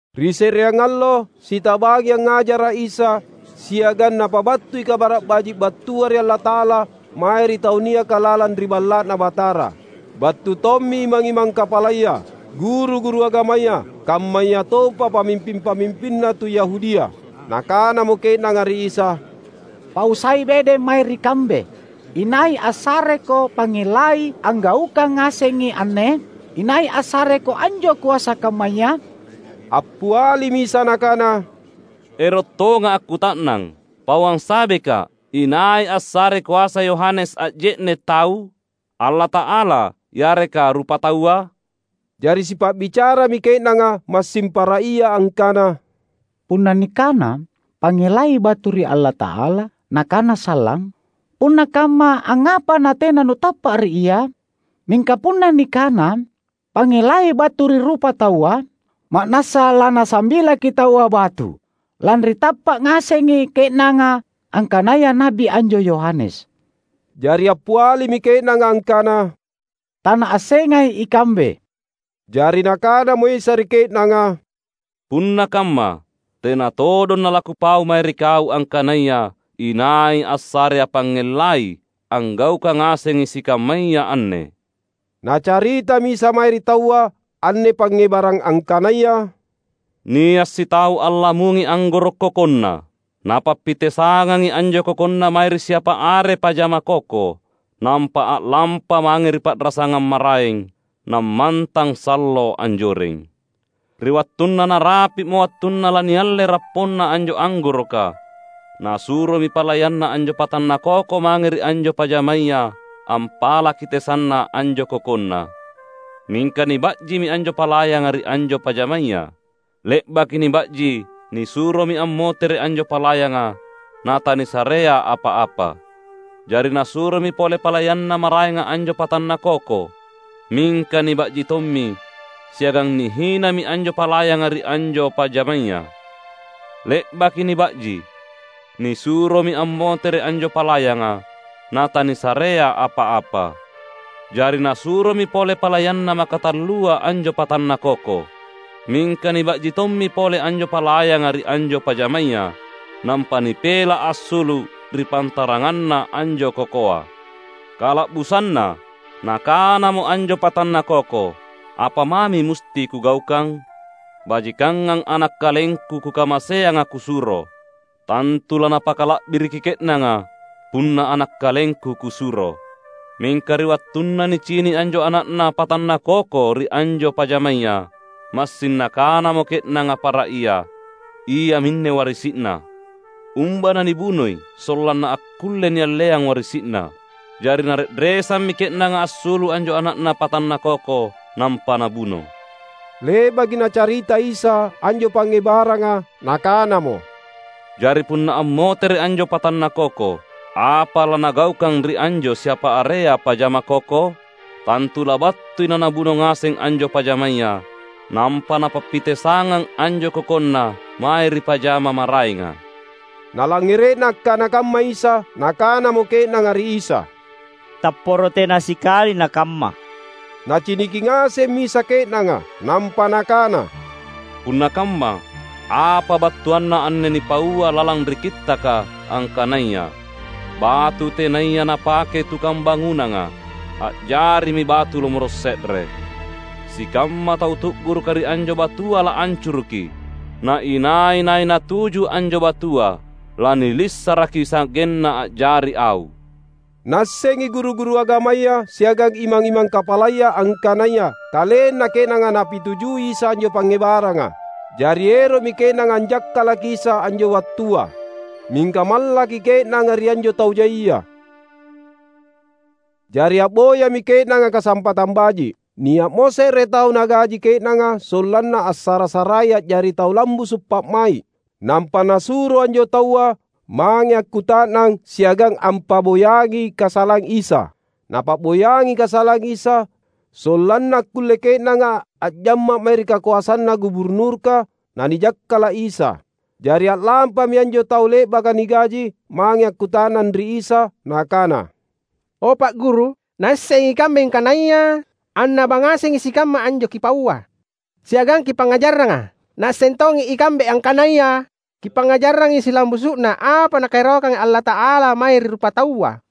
Ri se’reang allo, sitabangi angngajara’ Isa, siagang Napabattui Kabara’ Baji’ battua ri Allata’ala, mae ri tau niaka lalang ri Balla’Na Batara. Battu tommi imang-imang kapalaya, guru-guru agamaya, kammayatompa pamimping-pamimpinna tu Yahudia. Nakanamo ke’nanga ri Isa, "Pau sai bedeng mae ri kambe, inai assareKo pangngellai anggaukang ngasengi anne? Inai assareKo anjo koasa kammaya?" Appialimi Isa Nakana, "Ero’ tongA’ akkuta’nang. Pauang sabeKa’, inai assarei koasa Yohanes a’je’ne’ tau? Allata’ala yareka rupataua?" Jari sipa’bicarami ke’nanga massing para ia angkana, "Punna nikana, ‘Pangngellai battu ri Allata’ala,’ nakana sallang, ‘Punna kamma angngapa natena nutappa’ ri ia?’ Mingka punna nikana, ‘Pangngellai battu ri rupataua,’ ma’nassa lanasambilaki’ taua batu, lanri tappa’ ngasengi ke’nanga angkanaya na’bi anjo Yohanes." Jari appialimi ke’nanga angkana, "Tanaassengai ikambe." Jari Nakanamo Isa ri ke’nanga, "Punna kamma, tena todong nalaKupau mae ri kau angkanaya inai assareA’ pangngellai anggaukang ngasengi sikammaya anne." Nacaritami Isa mae ri taua anne pangngebarang angkanaya, "Nia’ sitau allamungi anggoro’ kokonna. Napappitesangangi anjo kokonna mae ri siapa are pajama koko. Nampa a’lampa mange ri pa’rasangang maraeng, nammantang sallo anjoreng. Ri wattunna narapi’mo wattunna lanialle rapponna anjo anggoroka, nasuromi palayanna anjo patanna koko mange ri anjo pajamaya ampalaki tesanna anjo kokonna. Mingka niba’jimi anjo palayanga ri anjo pajamaya. Le’baki niba’ji, nisuromi ammotere’ anjo palayanga, natanisarea apa-apa. Jari nasuromi pole palayanna maraenga anjo patanna koko. Mingka niba’ji tommi siagang nihinami anjo palayanga ri anjo pajamaya. Le’baki niba’ji, nisuromi ammotere’ anjo palayanga, natanisarea apa-apa. Jari nasuromi pole palayanna makatallua anjo patanna koko. Mingka niba’ji tommi pole anjo palayanga ri anjo pajamaya, nampa nipela’ assulu’ ri pantaranganna anjo kokoa. Kala’busanna nakanamo anjo patanna koko, ‘Apa mami musti kugaukang? Bajikangang ana’ kalengku kukamaseanga kusuro. Tantu lanapakala’biriki ke’nanga punna ana’ kalengku kusuro!’ Mingka ri wattunna nicini’ anjo ana’na patanna koko ri anjo pajamaya, massing nakanamo ke’nanga para ia, ‘Iaminne warisi’na. Umba nanibunoi, sollanna akkulle nialleang warisi’na.’ Jari nare’resammi ke’nanga assulu’ anjo ana’na patanna koko, nampa nabuno." Le’baki Nacarita Isa anjo pangngebaranga, Nakanamo, "Jari punna ammotere’ anjo patanna koko, apa lanagaukang ri anjo siapa area pajama koko? Tantu labattui nanabuno ngaseng anjo pajamaya, nampa napappitesangang anjo kokonna mae ri pajama maraenga." Nalangngere’na akkana kamma Isa, nakanamo ke’nanga ri Isa, "Tapporo tena sikali nakamma!" Naciniki ngasemmi Isa ke’nanga. Nampa Nakana, "Punna kamma, apa battuanna anne nipaua lalang ri Kittaka, angkanaya, ‘Batu tenaya napakei tukang bangunanga, a’jarimi batu lomoro’ se’re.’ Sikamma tau tu’guruka ri anjo batua laancuruki; na inai-nai natuju anjo batua lanilissaraki sa’genna a’jari au." Naassengi guru-guru agamaya siagang imang-imang kapalaya angkanaya kalenna ke’nanga Napitujui Isa anjo pangngebaranga. Jari ero’mi ke’nanga anjakkalaki Isa anjo wattua. Mingka mallaki ke’nanga ri anjo tau jaia. Jari a’boyami ke’nanga kasampatang baji’. Nia’mo se’re tau nagaji ke’nanga sollanna assara-sarai a’jari tau lambusu’ pa’mai’, nampa nasuro anjo taua mange akkuta’nang siagang ampa’boyangi kasalang Isa. Napa’boyangi kasalang Isa, sollanna akkulle ke’nanga a’jamma’ mae ri kakoasanna guburnurka, nanijakkala’ Isa. Jari a’lampami anjo tau le’baka nigaji, mange akkuta’nang ri Isa nakana, "O Pa’ Guru! Naassengi ikambe angkanaya annaba ngasengi sikamma anjo Kipaua siagang Kipangngajarranga. Naasseng tongi ikambe angkanaya Kipangngajarrangi silambusu’na apa Nakaerokanga Allata’ala mae ri rupataua,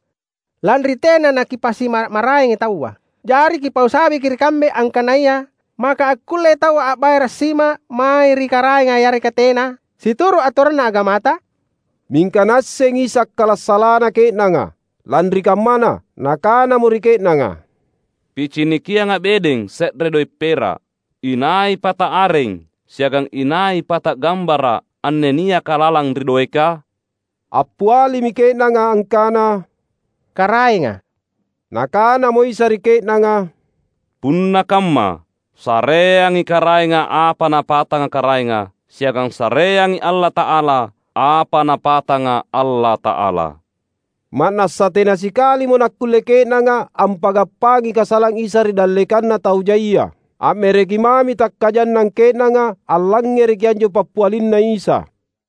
lanri tena naKipasimmara’-maraengi taua. Jari Kipau sabeki ri kambe, angkanaya, maka akkullei taua a’bayara’ sima mae ri karaenga yareka tena, situru’ atoranna agamata?" Mingka Naassengi Isa akkala’ salana ke’nanga. Lanri kammana, Nakanamo ri ke’nanga, "PicinikiangA’ bedeng se’re doe’ pera’. Inai pata areng siagang inai pata gambara’ anne niaka lalang ri doeka?" Appialimi ke’nanga angkana: "Karaenga." Nakanamo Isa ri ke’nanga, "Punna kamma, sareangi Karaenga apa napatanga Karaenga, siagang sareangi Allata’ala apa Napatanga Allata’ala." Ma’nassa tena sikalimo nakkulle ke’nanga ampanggappangi kasalang Isa ri dallekanna tau jaia. A’mereki mami takkajannang ke’nanga allangngereki anjo pappialinNa Isa.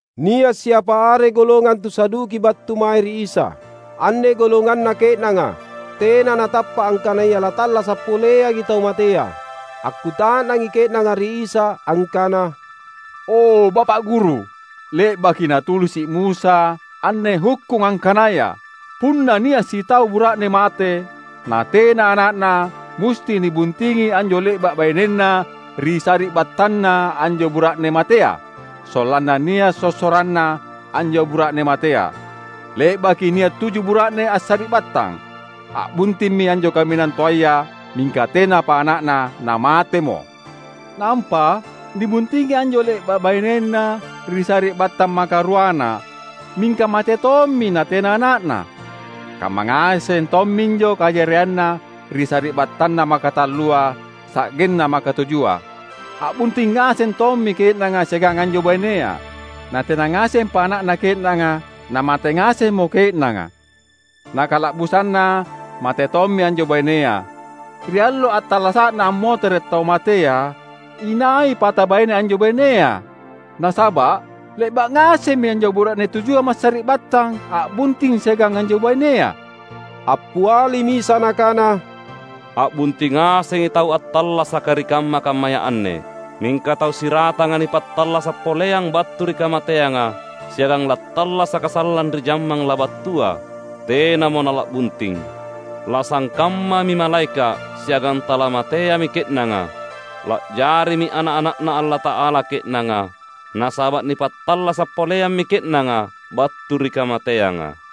Nia’ siapa are golongang tu Saduki battu mae ri Isa. (Anne golonganna ke’nanga, tena natappa’ angkanaya lattallasa’ poleangi tau matea.) Akkuta’nangi ke’nanga ri Isa angkana, "O Bapa’ Guru, le’baki natulisi’ Musa anne hukkung angkanaya: Punna nia’ sitau bura’ne mate, natena ana’na musti nibuntingi anjo le’ba’ bainenna ri sari’battanna anjo bura’ne matea, sollanna nia’ sossoranna anjo bura’ne matea. Le’baki nia’ tuju bura’ne assari’battang. A’buntimmi anjo kaminang toaya, mingka tenapa ana’na namatemo. Nampa nibuntingi anjo le’ba’ bainenna ri sari’battang makaruana mingka mate tommi natena ana’na. Kamma ngaseng tomminjo kajarianna ri sari’battanna makatallua sa’genna makatujua. A’bunting ngaseng tommi ke’nanga siagang anjo bainea, natena ngasempa ana’na ke’nanga namate ngasemmo ke’nanga. Na kala’busanna mate tommi anjo bainea. Ri allo attallasa’na ammotere’ tau matea, inai pata baine anjo bainea? Nasaba’ le’ba’ ngasemmi anjo bura’ne tujua massari’battang a’bunting siagang anjo bainea." Appialimi Isa Nakana, "A’bunting ngasengi tau attallasaka ri kamma-kammaya anne. Mingka tau siratanga nipattallasa’ poleang battu ri kamateanga, siagang lattallasaka sallang ri jammang labattua, tenamo nala’bunting. Lasangkammami malaeka’ siagang talamateami ke’nanga. La’jarimi ana’-ana’Na Allata’ala ke’nanga, nasaba’ nipattallasa’ poleammi ke’nanga battu ri kamateanga.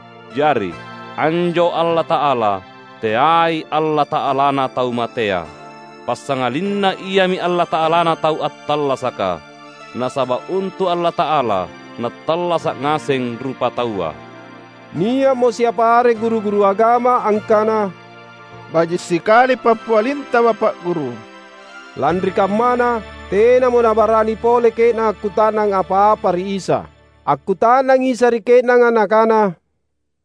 Jari, anjo Allata’ala, teai Allata’alana tau matea! Passangalinna Iami Allata’alana tau attallasaka! Nasaba’ untu’ Allata’ala nattallasa’ ngaseng rupataua." Nia’mo siapa are guru-guru agama angkana, "Baji’ sikali pappialinTa Bapa’ Guru." Lanri kammana, tenamo nabarani pole ke’nanga akkuta’nang apa-apa ri Isa. Akkuta’nangi Isa ri ke’nanga Nakana,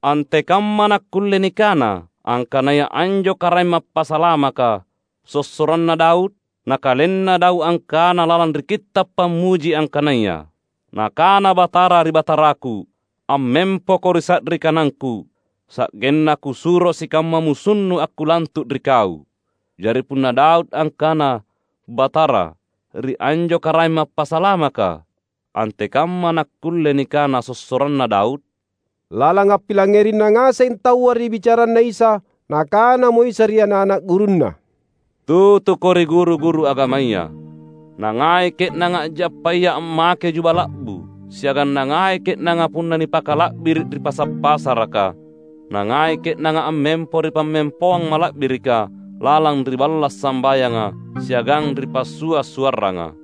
"Antekamma nakkulle nikana angkanaya anjo Karaeng Mappasalamaka sossoranna Daud? Na kalenna Daud angkana lalang ri Kitta’ Pammuji angkanaya, ‘Nakana Batara ri Bataraku: AmmempoKo ri sa’ri kanangKu, sa’genna Kusuro sikamma musunNu akkulantu’ ri Kau.’ Jari punna Daud angkana ‘Batara’, ri anjo Karaeng Mappasalamaka, antekamma nakkulle nikana sossoranna Daud?" Lalang appilangngerina ngaseng taua ri bicaranNa Isa, Nakanamo Isa ri ana’-ana’ gurunNa, "Tutuko ri guru-guru agamaya. Nangai ke’nanga a’jappaya ammake juba la’bu, siagang nangai ke’nanga punna nipakala’biri’ ri pasa’-pasaraka. Nangai ke’nanga ammempo ri pammempoang mala’birika lalang ri balla’ sambayanga siagang ri passua’-suarranga.